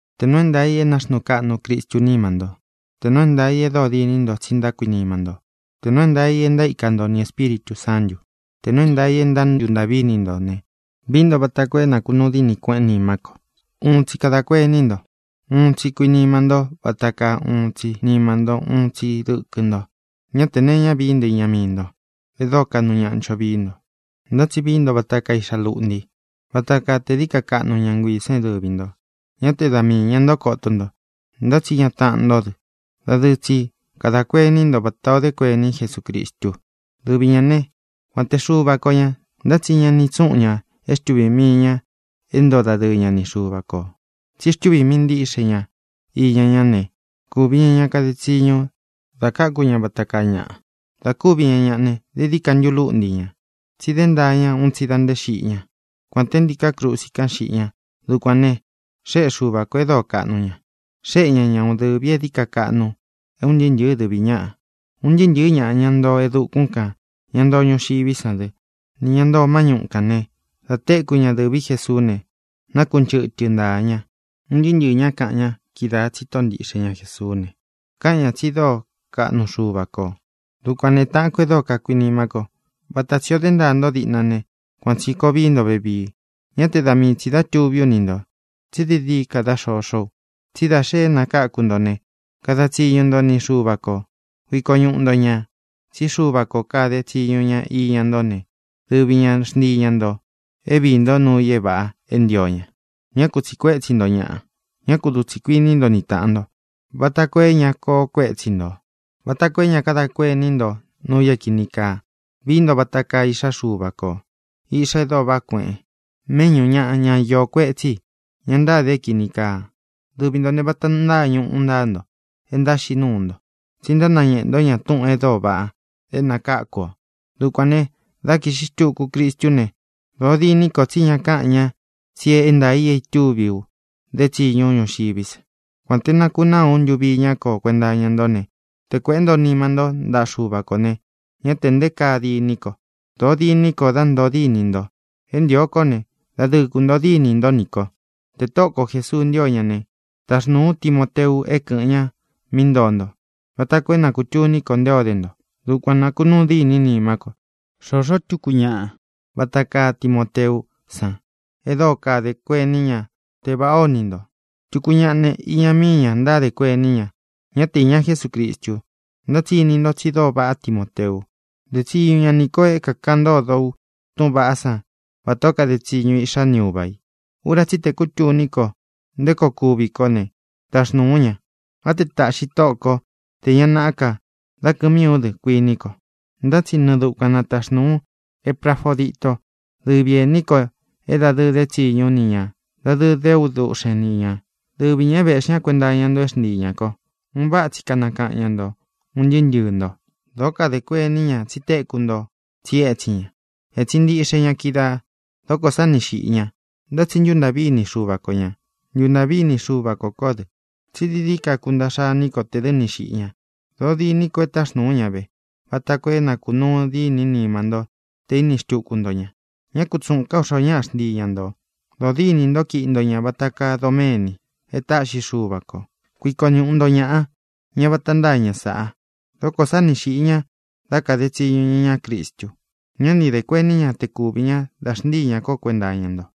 Tē nuu é ntaā i é naxnuu kaꞌnu Cristú nima ntó, tē nuu é ntaa ī e dóo diní nto tsi ntákuinima ntó, tē nuu é ntaā i e ntaíka nto ni Ēspíritū Sántu, tē nuu é ntaā i e ntántuntaꞌví ini nto ne, vií nto vata koo é nākunuu dínī kueꞌén nimá ko. Uun tsi kadā kuení nto. Uun tsi kuínima ntó vata kaa uun tsi nima ntó, uun tsi dɨkɨ nto. Ñá tē nee iñá vií nto iña mii nto, e dóo kaꞌnu ñaꞌa ncho vií nto, ntá tsi vií nto vata kaa iꞌxá luꞌnti, vata kaa te dií ka kaꞌnu ña nguiī san é dɨvi ntō. Ñá te da mii īña nto koto nto, ntá tsi iña taꞌan ntó dɨ. Dadɨɨ tsi kadā kuení nto vatā o dé kuení Jesucristu. Dɨvi ñā né, kuān té Xuva ko ñā, ntá tsi ña ni itsúꞌun ñā é xtuvī mii ña é ntoo dadɨɨ ña ni Xuva kō, tsi xtúvī mii ntiꞌxe ña íña ñá ne, kūvi ña ña kade tsiñu da káku ña vata kaa ñaꞌa. Dā kúvi ña ñaꞌa ne, dií dií ka ntulúꞌnti ñā, tsí dé ntaa ña un tsi da nté xiꞌi ñá, kuān te ntíkā krusi kán xiꞌi ña. Dukuān ne, xéꞌe Xuva kō e dóo kaꞌnu ña. Xéꞌe ña ña uun dɨ̄vi é dií ka kaꞌnu é un ntɨɨ́ ntɨ̄ɨ́ dɨ̄ví ñaꞌa. Un ntɨɨ́ ntɨ̄ɨ́ ñaꞌa, ña ntoo e dukún kān, ña ntoo ñuxiví san dɨ, nī ña ntoo má ñuꞌu kān ne, dá tekū ñá dɨ̄ví Jesuú ne, nákunchɨtɨ ntāa ña. Un ntɨɨ́ ntɨɨ̄ ñá kaꞌan ña kídaā tsi Tóꞌo ntiꞌxe ña Jēsuú ne, káꞌan ñā tsi dóo kaꞌnu Xuva kō. Dukuān ne, táꞌān kó e dóo kakuinimá ko, vata tsī o dé ntaa nto diꞌna ne, kuan tsī koo vií nto vevii. Ñá te da mii tsī dá tūví u ni ntō, tsí dií dií ka dá xoxó u. Tsí da xe é nakáku nto ne, kada tsiñu nto ni Xuva kō. Kuiko ñuꞌu nto ñā. Tsí Xuva ko kade tsiñu ña ni ntō ne, dɨvi ña xntii ña ntō é viī ntó nuu i é vāꞌa é ntio ña. Ñá ku tsīꞌi kuétsi nto ñaꞌa. Ñá ku dutsi kuinī ntó ni tāꞌan nto, vata koo é ña koo kuétsi ntō, vata koo é ña kadá kuení nto nuu i é kīni kaa. Vií nto vata kaa iꞌxá Xuva kō, iꞌxá e dóo vaꞌá kueꞌen, méꞌñū ñaꞌa, ñá iō kuetsí i, ña ntáde é kīni kaa. Dɨvi ntō ne, vata ntaa ñuꞌu ntáa nto é ntánaxiꞌí nuu nto, tsi ntánañēꞌe nto ñaꞌa túꞌūn e dóo vaꞌa é nākáku ō. Dukuān ne, dá kīꞌxi xtuku Cristú ne, dōo diní ko tsí ña káꞌan ña tsi é ntaā i é itúvi ú dé tsiñu ú ñuxiví sa. Kuān té nakunáa ú ntuvi iñá ko kuenta iña ntó ne, te kuēꞌé nto nima ntó ntaꞌa Xuva kō ne, ñá tē nté kaa diní ko. Dōo diní ko dá ntoo díni nto. É ntīo kó ne, dadɨɨ kuntōo díni ntó nī ko. Tē Tóꞌo ko Jēsuu ntío ña ne, taxnūu ú Timoteu é kɨ̄ꞌɨn ña mí ntoo nto vata koo é na kūtuní ko nté o de nto. Dukuan nākunúu diní nimá ko. Xôxó tukú ñaꞌa vata kaa Timoteú san e dóo kadē kuení ña te vāꞌá o ini nto. Tuku ñaꞌa ne, iña míi ña ntádē kuení ña, ñá te īña Jesúcristu. Ntá tsi ini nto tsi dóo vaꞌá Timoteu. De tsiñu ña nī ko é kākaꞌan ntódo u túꞌūn vaꞌá san vatā ó kade tsiñu iꞌxá ni uva ī. Ura tsí i tē kútuní ko nté koo kuvi kó ne, taxnūu ú ña. Á te tāꞌxi Tóꞌo ko tē ña naꞌá ka dá kɨ̄ꞌɨn mii ú dɨ, kuiní ko. Ntá tsi nɨɨ dukuan nataxnūu ú Eprafodito, dɨvi ēní kō é dadɨɨ dé tsiñu ú ni ñā, dadɨɨ dé u duꞌxen ni ñā, dɨvi ñā é vēꞌxí ña kuenta iña nto é xntii ñā ko. Un váꞌa tsi kanakaꞌan ña ntō, un ntɨɨ́ ntɨɨ̄ nto. Dōó kadē kuení ña tsi téku nto tsí etsin ña. Ētsin ntiꞌxe ña kídaā. Dókō sá ni xīꞌi ña. Ntá tsi ntúntāꞌví ini Xuva ko ñā. Ntuntāꞌví ini Xuva kō kó dɨ, tsí dií dií ka kúntaꞌxa iní ko tē dɨ́ ni xīꞌi ña. Dōo diní ko é taxnūu ú ña ve, vata koo é nakunúu diní nima ntó tē íni xtuku nto ña. Ñá kutsuꞌūn ká u xoo ñáꞌa xntii ña ntō. Dodínī nto kíꞌi nto ña vata kaa doméni e táꞌxi Xuva kō. Kuiko ñuꞌu nto ñāꞌa, ña vata ntáa ña sāꞌa. Dókō sá ni xīꞌi ña dá kade tsiñu ña iñá Cristu. Ñá ni dē kuení ña te kuvī ñá da xntíi ñā kó kuenta iña nto.